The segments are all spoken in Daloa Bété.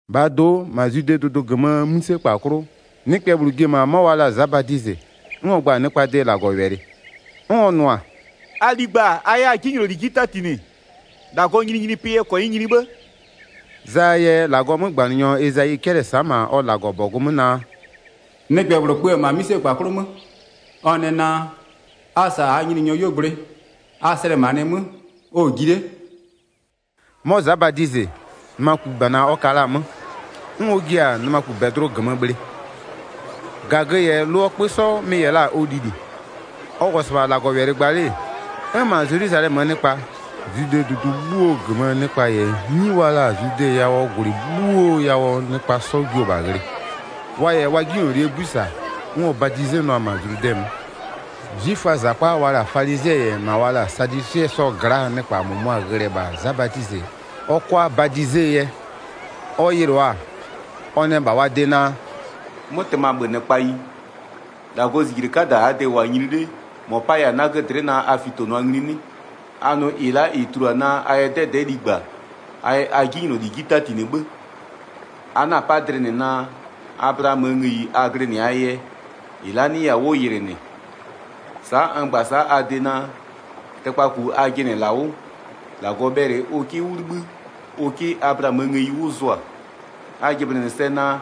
1-Bhaa do'o, -ma Zwidee dʋdʋ -gömöö 'mïsekpa 'klʋ, nɩkpɛ -bhlʋ ji-e -ma 'mɔ wa la-a Za Badizɩ, 'n ɔ gba-a nɩkpaa de -Lagɔwɛlɩ, 'n ɔ nʋ-a: “A ligba a 'yɛ a 'jinyloli 'ji 'tatinɩ. -Lagɔɔ nyininyinipɩ yɛ -kɔnyɩ nyini 'bhë.” Zaa yɛ -Lagɔɔ 'mögbanɩnyɔ Ezayi 'cɛlɩ-ɛ sa'a -ma ɔ -Lagɔbɔgʋ 'mö naa: “Nɩkpɛ -bhlʋ kpö-ö -ma 'mïsekpa 'klʋ 'mö, ɔ nɛ naa: A -sa -aa Nyininyɔɔ 'yuogblʋɩ, a slɛmanɩɩ 'mö, ɔ-ɔ ji 'le.” 'Mɔ Za Badizɩ, nɩmakubana ɔ ka la-a 'mö, 'n ɔ jia-a nɩmakubɛdlʋ -gömö bhlɩ. -Gagö -yɛ lʋɔ 'kpö 'sɔ mɩ-ɩ -yɛ la-a ɔ lili. Ɔ -wʋ-ɔ -sɩbha -Lagɔwɛlɩ gba 'le-e, 'n -ma Zelwizalɛmöö nɩkpa-a, Zwidee dʋdʋ 'bhuo -gömöö nɩkpa -yɛ 'nyi wa la-a Zludɛɛ yawʋɔ -gwlɩ 'bhuoo yawʋɔ nɩkpa 'sɔ jio-o -bha ghlɩ. Wa -yɛ wa 'jinylolie 'bui -sa, 'n ɔ badizenʋa-a -ma Zludɛ 'mö. 'Zwiföaa -zakpa wa la-a falizɩɛ -yɛ -ma wa la-a sadwisɩɛ 'sɔɔ gla'aa nɩkpa -mʋmʋa ghlɩ-ɛ -bha Za Badizɩ ɔ 'kʋa badizee yɛ. Ɔ yɩlʋa-a, ɔ nɛ -bha wa de naa: “'Mʋtɩmabhönɩkpayi, -Lagɔɔ -zijle 'kada -aa de-e -wʋ-a nyini 'le, -mɔ 'paya-a 'nagö dlɩ'ɩ naa a fitonʋa ngli 'nɩ? A nʋ -ɩ la'a -ɩ tulua naa a yɛ 'dɛdɛ'ɛ ligba a yɛ a 'jinyloli 'ji 'tatinɩ 'bhë. A 'na-a 'pa dlɩ -nɩ naa, Ablaamöö ngëyi a glɩnɩ-aa yɛ, -ɩ la'a 'nɩya-a 'wʋ yɩlɩ -nɩ. Sa'a n gba-a sa'a a de naa: Tɩkpaku a jɩnɩ-ɛ -la 'wʋ, -Lagɔ bhɛlɩ ʋ 'kɩ 'wʋ 'libhï ʋ 'kɩ Ablaamöö ngëyi 'wʋ zʋa. A jɩblɩnɩ sɛ naa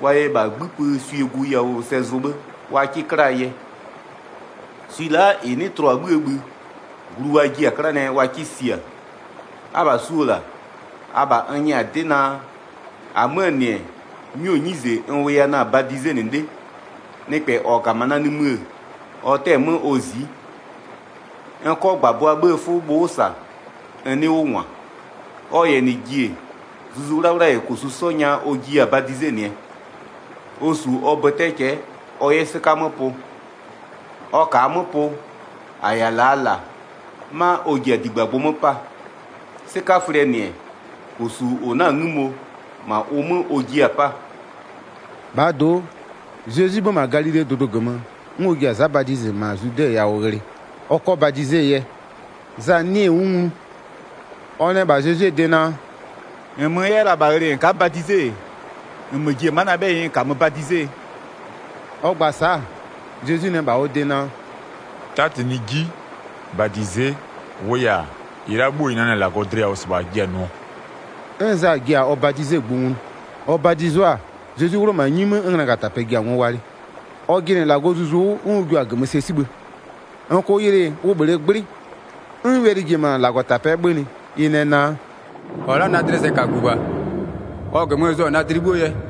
wa yɛ -bha 'gbïpö swie gu yawʋ sɛ zʋ 'bhë wa 'kɩ 'klaa yɛ. Swi la'a -ɩ 'nɩ tlʋ-a 'bhïë bhï, glu wa jiɩ-a 'klanɩɛ wa 'kɩ sia. Abha su-o -la, abha n nyɛ-a 'dɩ naa: -Amöö -nɩ-ɛ, 'nyuo 'nyize n wʋya na-a badizenɩ 'le. Nɩkpɛ -ɔ -ga-a -ma na nimï-ë, ɔ 'tɛ-ɛ 'mö ɔ zi'i. N 'kɔ -gbabʋa 'bhëë 'fʋ bhʋ'ʋ -sa n 'nɩ 'wʋ -ngwa. Ɔ -yɛ -nɩ ji-e, Zuzu 'Wlawla -yɛ -kosu 'sɔ nya ɔ jiya-a badizenɩɛ. Ɔ -su ɔ bötɛ cɛ'ɛ ɔ 'yɛ 'sɩka 'mö pʋ. Ɔ -kaa 'mö pʋ, -a -yɛ-a -laa -la, 'ma ɔ ji-a -digbagbʋ 'mö 'paa. 'Sɩkaflɩɛ -nɩ-ɛ, -kosu -ʋ 'na-a 'ngïmo, -ma ʋ 'mö ɔ jiɩ-a 'paa.” Za Badizɩ yɛ Zezwi badize 13-Bhaa do'o, Zezwi 'bhö-ö -ma Galilee dʋdʋ -gömö, 'n ɔ ji-a Za Badizɩ -ma Zludɛ yawʋ ghlɩ, ɔ 'kɔ badizee yɛ. Za 'nɩɩ-ɩ 'wʋ nglu, ɔ nɛ -bha Zezwie de naa: “-Nmö n 'yɛ la-a -bha ghlɩ -n ka'a badize-e, -nmö ji-e ma'a na 'bhɛyɩ n -kamö badizee?” Ɔ gba-a sa'a, Zezwi nɛ -bha ɔ de naa: “'Tatinɩɩ 'ji, -badize'e, -wʋʋ yɛ-a, -ɩ la'a 'bhuo -ɩ nanɩ-a -Lagɔ dlɩ yawʋ -sɩbha -a jiɩ-a nʋɔ.” 'N Za ji-a ɔ badizegbʋ nglu. Ɔ badizo-a, Zezwi 'wlʋ-ɔ -ma 'nyi 'mö 'n nglagatapɛ ji-a ngo walɩ. Ɔ jɩnɩ -Lagɔɔ Zuzu 'wʋ, 'n ʋ jio-a -gömö sɛ 'sibhë. -N -kʋʋ yɩlɩ ʋ -bhlee 'gblɩ. 'N wɛlɩ ji-e -ma -Lagɔtapɛ'ɛ 'bhönɩ, ɩ nɛ naa: “-Ɔ la'a na dlɩɛ sɛkagu -bha. Ɔ -gömö n zʋ-a na dlɩ 'bhuo yɛ.”